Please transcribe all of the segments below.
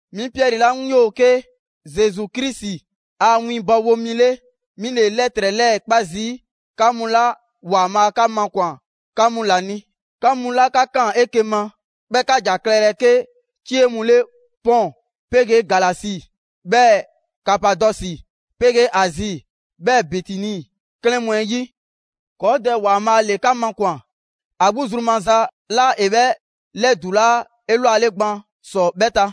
'Mi Piɛri 'la 'ŋ 'yoo‑ 'ke Zesu Krisi a winbɔwo mi 'le, 'mi ‑le 'lɛtrɛ 'lɛɛ‑ 'kpa zii' 'ka mu 'la ‑Waanbhaa' 'ka makwan‑ 'ka mu ‑la ni. 'Ka mu 'la 'ka ꞊kaan 'eke‑ ma, 'bhɛɛ‑ 'ka ‑ja klɛlɛ 'ke 'cie mu 'le Pɔn 'pegee Galasi, 'bhɛɛ ‑Kapadɔsi 'pegee Azi, 'bhɛɛ‑ Bitini 'klɛɛn mu 'ɛ 'yi. 'Kɔɔ‑ Dɛ ‑Waanbhaa' ‑le 'ka makwan‑ 'a 'gbu zru maza 'la ‑e 'bhɛ 'lɛdulaa 'elwale gban ‑sɔ 'bhɛ ta.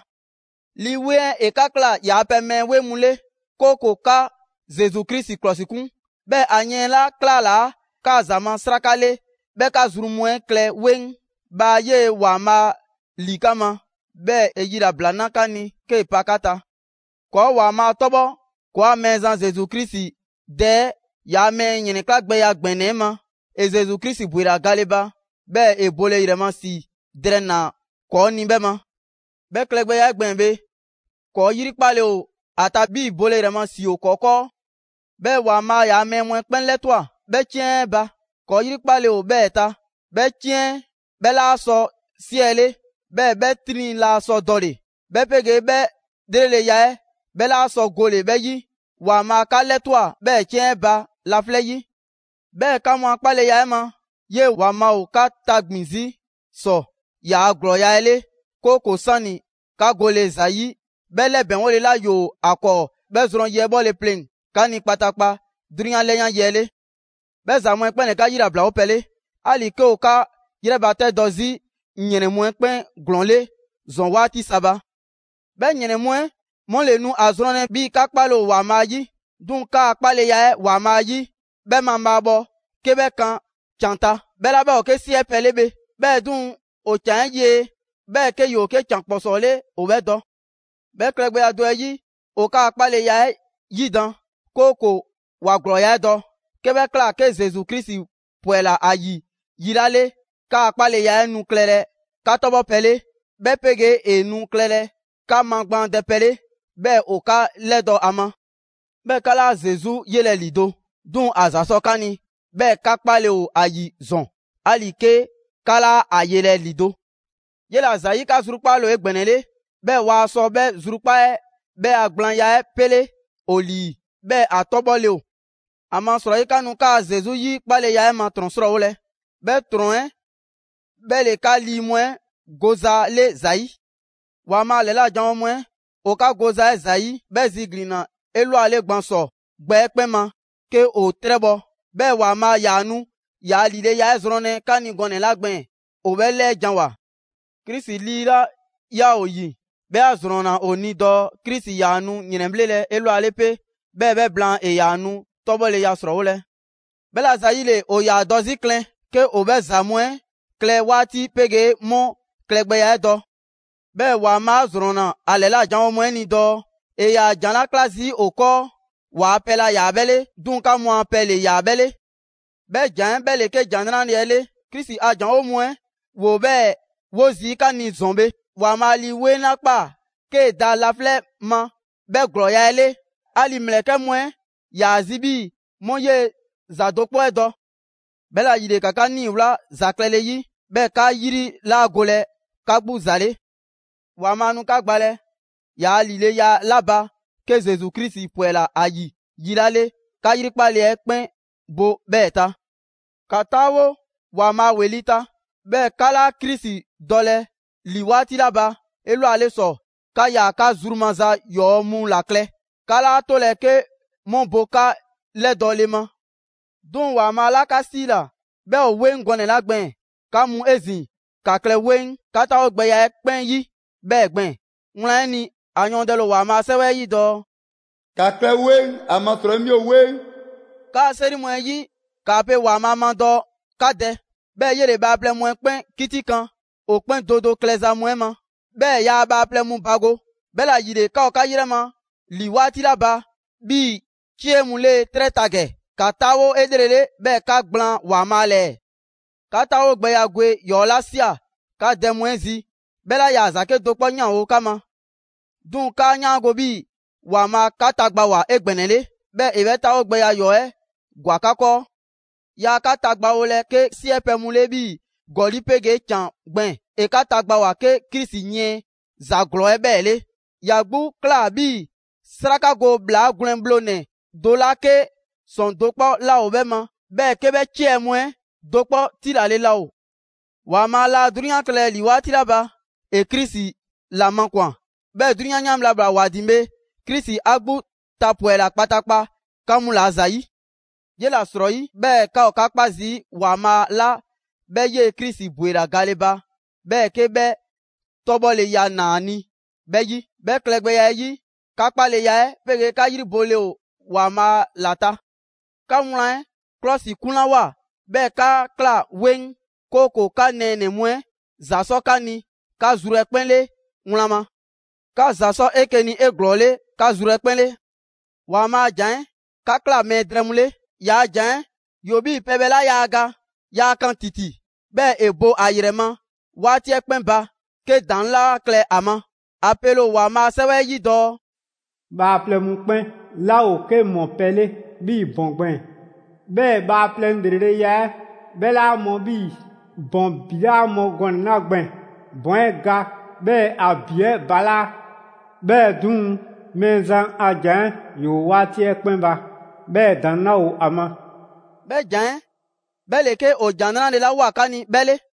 Lii 'Weŋ 'ɛ ‑e 'ka ꞊kla ‑yaa' pɛ mɛɛ 'weŋ mu 'le, 'kooko‑ 'ka Zesu Krisi 'klɔsikun, 'bhɛɛ‑ ‑a yiɛn 'la 'klalaa 'kaa‑ ‑za ma 'sraka 'le 'bhɛ 'ka zru mu 'ɛ klɛ 'weŋ. Bhaa 'yee‑ ‑Waanbhaa' ‑li 'ka ma, 'bhɛɛ‑ ‑e yilabla na 'ka ni 'kee‑ pa 'ka ta. ‑Kɔɔ' ‑Waanbhaa' 'tɔbhɔ ‑kɔɔa' Mɛɛzan Zesu Krisi Dɛ 'ɛ! ‑Yaa' mɛɛ ‑yrɛnklagbɛya ‑gbɛnɛ 'ɛ ma, ‑e Zesu Krisi ‑bwela gale ba, 'bhɛɛ‑ ‑e bole ‑yrɛ ma ‑si drɛɛ ‑naa ‑kɔɔ' ni 'bhɛ ma. 'Bhɛ klɛgbɛya 'ɛ gbɛɛn‑ bhe, ‑kɔɔ' 'yrikpale ‑o ‑a ta 'bhii‑ bole ‑yrɛ ma ‑si ‑o ‑kɔɔ' 'kɔɔ. 'Bhɛɛ‑, ‑Waanbhaa' ‑yaa' mɛɛ mu 'ɛ 'kpɛn 'lɛtwa꞊ 'bhɛɛ‑ 'ciɛn 'ɛ ba, ‑kɔɔ' 'yrikpale ‑o 'bhɛɛ‑ ta. 'Bhɛ 'ciɛn 'ɛ bhɛ laa sɔ 'siɛle, 'bhɛɛ‑ 'bhɛ 'triŋ 'laa sɔ dɔle‑, 'bhɛ 'pegee 'bhɛ ‑lreleya 'ɛ 'bhɛ 'laa sɔ gole‑ 'bhɛ 'yi. ‑Waanbhaa' 'ka 'lɛtwa꞊ 'bhɛɛ‑ 'ciɛn 'ɛ ba laflɛ' 'yi. 'Bhɛɛ‑ 'ka mu a 'kpaleya 'ɛ ma, 'yee‑ ‑Waanbhaa' ‑o 'ka tagbin‑ 'zi ‑sɔ ‑yaa' ‑glɔɔya' 'ɛ 'le, 'kooko‑ 'sani‑ 'ka gole ‑za 'yi 'bhɛ 'lɛbɛŋgole 'la ‑yoo ‑a 'kɔɔ 'bhɛ zrɔn yi 'ɛ 'bhɔle pleŋ‑ 'ka ni kpataakpa 'drunyan 'lɛyan yi 'ɛ 'le. 'Bhɛ ‑za mu 'ɛ 'kpɛn ‑le 'ka 'yilablawo pɛ 'le, 'ali‑ 'ke ‑o 'ka 'yrɛbatɛdɔ 'zi ‑yrɛn mu 'ɛ 'kpɛn ‑glɔɔn 'le ‑zɔn 'waati sa ba. 'Bhɛ ‑yrɛn mu 'ɛ 'mu ‑le nu a zrɔnlɛ 'bhii‑ 'ka 'kpale‑ ‑o ‑Waanbhaa' 'yi. 'Duŋ‑ 'kaa‑ 'kpaleya 'ɛ ‑Waanbhaa' 'yi, 'bhɛ mabhaabhɔ 'ke 'bhɛ kan ‑can ta, 'bhɛ 'la 'bhɛ ‑o 'ke 'siɛ pɛ 'le bhe. 'Bhɛɛ‑ 'duŋ‑, ‑o ‑can 'ɛ yie, 'bhɛɛ‑ 'ke ‑yoo 'ke ‑can ‑kpɔsɔɔ 'le ‑o 'bhɛ dɔ. 'Bhɛ klɛgbɛya do 'ɛ 'yi, ‑o 'kaa‑ 'kpaleya 'ɛ 'yidan‑, 'kooko‑ ‑wa ‑glɔɔya' 'ɛ dɔ. 'Ke 'bhɛ ꞊kla, 'ke Zesu Krisi 'pwɛla‑ ‑a ‑yi yi 'la 'le, 'kaa‑ 'kpaleya 'ɛ nu klɛlɛ 'ka 'tɔbhɔpɛ 'le, 'bhɛ 'pegee ‑e nu klɛlɛ 'ka magbaandɛpɛ 'le, 'bhɛɛ‑ ‑o 'ka 'lɛdɔ‑ ‑a ma. 'Bhɛɛ‑ 'ka 'laa Zesu 'yelɛ‑ ‑lido', 'duŋ‑ ‑a ‑za sɔ 'ka ni, 'bhɛɛ‑ 'ka 'kpale‑ ‑o ‑a ‑yi ‑zɔn, 'ali‑ 'ke 'ka 'laa 'a 'yelɛ‑ ‑lido'. 'Yela‑ ‑zayi', 'ka zrukpaale ‑o 'egbɛnɛle, 'bhɛɛ‑ waa sɔ 'bhɛ zrukpaa' 'ɛ 'bhɛ a gblaanya 'ɛ 'pele ‑o ‑lii, 'bhɛɛ‑ ‑a 'tɔbhɔle ‑o. ‑Amasrɔyi 'ka nu kaa‑ Zesu 'yi 'kpaleya 'ɛ ma ‑trɔn 'srɔɔwolɛ, 'bhɛ ‑trɔn 'ɛ 'bhɛ ‑le 'ka lii mu 'ɛ goza 'le ‑zayi'. ‑Waanbhaa' ‑lɛla' janwo mu 'ɛ ‑o ka goza 'ɛ ‑zayi' 'bhɛ ziglinna 'elwale gban ‑sɔ gbɛ 'ɛ 'kpɛn ma 'ke ‑o 'trɛbhɔ‑. 'Bhɛɛ‑ ‑Waanbhaa' ‑yaa nu ‑yaa' ‑lileya 'ɛ zrɔnlɛ 'ka ni gɔnɛ‑ 'la gbɛɛn‑ ‑o 'bhɛ 'lɛɛ ‑janwoa. Krisi Lii 'la 'yaa‑ ‑o ‑yi, 'bhɛ 'a ‑zrɔnna ‑o ni dɔɔ Krisi ‑yaa nu ‑yrɛnbhlelɛ 'elwale 'pe, 'bhɛɛ‑ 'bhɛ blaan, ‑e ‑yaa nu 'tɔbhɔleya ‑srɔɔwolɛ. 'Bhɛla‑ ‑zayile, ‑o ‑yaa dɔ 'zi klɛn 'ke ‑o 'bhɛ ‑za mu 'ɛ klɛ 'waati 'pegee 'mu klɛgbɛya 'ɛ dɔ. 'Bhɛɛ‑ ‑Waanbhaa' 'a ‑zrɔnna ‑a ‑lɛla' janwo mu 'ɛ ni dɔɔ ‑e ‑yaa ‑jan 'la 'kla zii' ‑o 'kɔɔ, ‑waa' pɛ laa ‑yaa 'bhɛ 'le, 'duŋ‑ 'ka mu a pɛ ‑le ‑yaa 'bhɛ 'le. 'Bhɛ ‑jan 'ɛ 'bhɛ ‑le 'ke ‑Jan 'Nrale‑ 'ɛ 'le. Krisi ‑a ‑janwo' mu 'ɛ ‑woo 'bhɛɛ‑ 'wo zii' 'ka ni ‑zɔn bhe ‑Waanbhaa' Lii 'Weŋ 'la ꞊kpaa 'kee‑ da laflɛ' ma 'bhɛ ‑glɔɔya' 'ɛ 'le. 'Ali‑ ‑mlɛkɛ' mu 'ɛ 'yaa‑ zi 'bhii‑ 'mu 'yee‑ ‑za do 'kpɔ 'ɛ dɔ. 'Bhɛla‑ ‑yile, ‑ka 'ka 'niiwla ‑za klɛle 'yi, 'bhɛɛ‑ 'ka 'yri 'laa golɛ 'ka 'gbu ‑za 'le. ‑Waanbhaa' nu 'ka gbalɛ ‑yaa ‑lileya 'la ba 'ke Zesu Krisi 'pwɛla‑ ‑a ‑yi yi 'la 'le, 'ka 'yrikpale 'ɛ 'kpɛn bo 'bhɛɛ‑ ta. ‑Ka 'taawo ‑Waanbhaa' ‑weli' ta. 'Bhɛɛ‑ 'ka 'laa Krisi dɔlɛ ‑li 'waati 'la ba 'elwale ‑sɔ, 'ka 'yaa‑ 'ka zru maza ‑yɔɔ' mu 'la klɛ, 'ka 'laa 'tolɛ‑ 'ke 'mu bo 'ka 'lɛdɔɔle ma. 'Duŋ‑ ‑Waanbhaa' 'la 'ka 'siila‑, 'bhɛ ‑o 'weŋ gɔnɛ‑ 'la gbɛɛn‑, 'ka mu 'ezin‑, ‑ka klɛ 'weŋ 'ka 'taawogbɛya 'ɛ 'kpɛn 'yi 'bhɛɛ‑ gbɛɛn‑. Wlan 'ɛ ni, ‑a yɔɔndɛle ‑o ‑Waanbhaa' a 'Sɛwɛ 'ɛ 'yi dɔɔ: «‑Ka klɛ 'weŋ, ‑amasrɔyi 'mi ‑o 'weŋ.» 'Kaa‑ 'seri mu 'ɛ 'yi, 'kaa pe ‑Waanbhaa' ma dɔɔ 'ka Dɛ. 'Bhɛɛ‑ 'yele‑ bhaaplɛŋ mu 'kpɛn 'kitikan ‑o 'kpɛn do do klɛza mu 'ɛ ma. 'Bhɛɛ‑ yaa bhaaplɛŋ mu bago. 'Bhɛla‑ ‑yile, 'ka ‑o 'ka 'yrɛ ma ‑li 'waati 'la ba 'bhii‑ 'cie mu 'le 'trɛ ta ‑gɛ, ‑ka 'taawo 'elrele 'bhɛɛ‑ ‑ka ‑gblaan' ‑Waanbhaa' ‑lɛɛ. 'Ka 'taawogbɛya gwe ‑yɔɔ' 'la ꞊sia 'ka dɛ mu 'ɛ zi, 'bhɛ 'laa ‑yaa ‑za 'kedo‑ 'kpɔ ‑yanwo' 'ka ma. 'Duŋ‑ 'kaa 'yaango‑ 'bhii‑ ‑Waanbhaa' 'ka tagbawoa 'egbɛnɛle, 'bhɛɛ‑ ‑e 'bhɛ 'taawogbɛya ‑yɔɔ' 'ɛ ‑gwa 'ka 'kɔɔ. Yaa 'ka tagbawolɛ 'ke 'siɛ pɛ mu 'le 'bhii‑ ‑gɔli' 'pegee ‑can gbɛɛn‑, ‑e 'ka tagbawoa 'ke Krisi yiɛn ‑za ‑glɔɔ 'ɛ 'bhɛɛ‑ 'le. ‑Ya 'gbu ꞊kla 'bhii‑ 'sraka go ‑bhlaa gwlɛn bhlonɛ‑ do 'la 'ke ‑sɔŋ' do 'kpɔ 'laa ‑o 'bhɛ ma, 'bhɛɛ‑ 'ke 'bhɛ 'ciɛ‑ mu 'ɛ do 'kpɔ tilale laa ‑o. ‑Waanbhaa' laa 'drunyan klɛlɛ ‑li 'waati 'la ba, ‑e Krisi ‑la makwan‑. 'Bhɛɛ‑ 'drunyan 'yan bhla 'la ꞊bhwa ‑wa ‑din bhe, Krisi 'a 'gbu tapwɛla kpataakpa 'ka mu ‑la ‑zayi'. 'Yela‑ 'srɔyi, 'bhɛɛ‑ 'ka ‑o 'ka 'kpa zii' ‑Waanbhaa' 'la 'bhɛ 'yee‑ Krisi ‑bwela gale ba 'bhɛɛ‑ 'ke 'bhɛ 'tɔbhɔleya ꞊naa ‑a ni 'bhɛ 'yi. 'Bhɛ klɛgbɛya 'ɛ 'yi, 'ka 'kpaleya 'ɛ 'pegee 'ka 'yri bole ‑o ‑Waanbhaa' ‑la ta. 'Ka wlan 'ɛ 'klɔsikunlawoa, 'bhɛɛ‑ 'ka ꞊kla 'weŋ, 'kooko‑ 'ka nɛɛnɛ‑ mu 'ɛ ‑za sɔ 'ka ni 'ka zru 'ɛ 'kpɛn 'le wlan ma. 'Ka ‑za 'sɔ 'eke‑ ni 'eglɔɔle 'ka zru 'ɛ 'kpɛn 'le. ‑Waanbhaa' a ‑jan 'ɛ 'ka ꞊kla mɛɛ drɛɛ mu 'le. Yaa ‑jan 'ɛ ‑yoo ‑o 'bhii‑ pɛbhɛ 'la yaa ga. Yaa kan ‑titi, bhɛɛ‑ ‑e bo ‑a ‑yrɛ ma 'waati 'ɛ 'kpɛn ba 'ke ‑daŋ' 'laa klɛ ‑a ma. ‑A pele ‑o ‑Waanbhaa' a 'Sɛwɛ 'ɛ 'yi dɔɔ: «Bhaaplɛŋ mu 'kpɛn 'laa ‑o 'ke mɔpɛ 'le 'bhii‑ ‑bɔn gbɛɛn‑. 'Bhɛɛ‑ bhaaplɛŋ ‑lreleya 'ɛ 'bhɛ 'laa mɔ 'bhii‑ ‑bɔn ‑bi 'laa mɔ gɔnɛ‑ 'la gbɛɛn‑. ‑Bɔn 'ɛ ga 'bhɛɛ‑ ‑a ‑bi 'ɛ balaa'. 'Bhɛɛ‑ 'duŋ‑, Mɛɛzan a ‑Jan 'ɛ ‑yoo 'waati 'ɛ 'kpɛn ba, 'bhɛɛ‑ ‑daŋ' 'laa ‑o ‑a ma.» 'Bhɛ ‑jan 'ɛ 'bhɛ ‑le 'ke ‑o ‑Jan 'Nrale‑ 'la ꞊woa 'ka ni 'bhɛ 'le.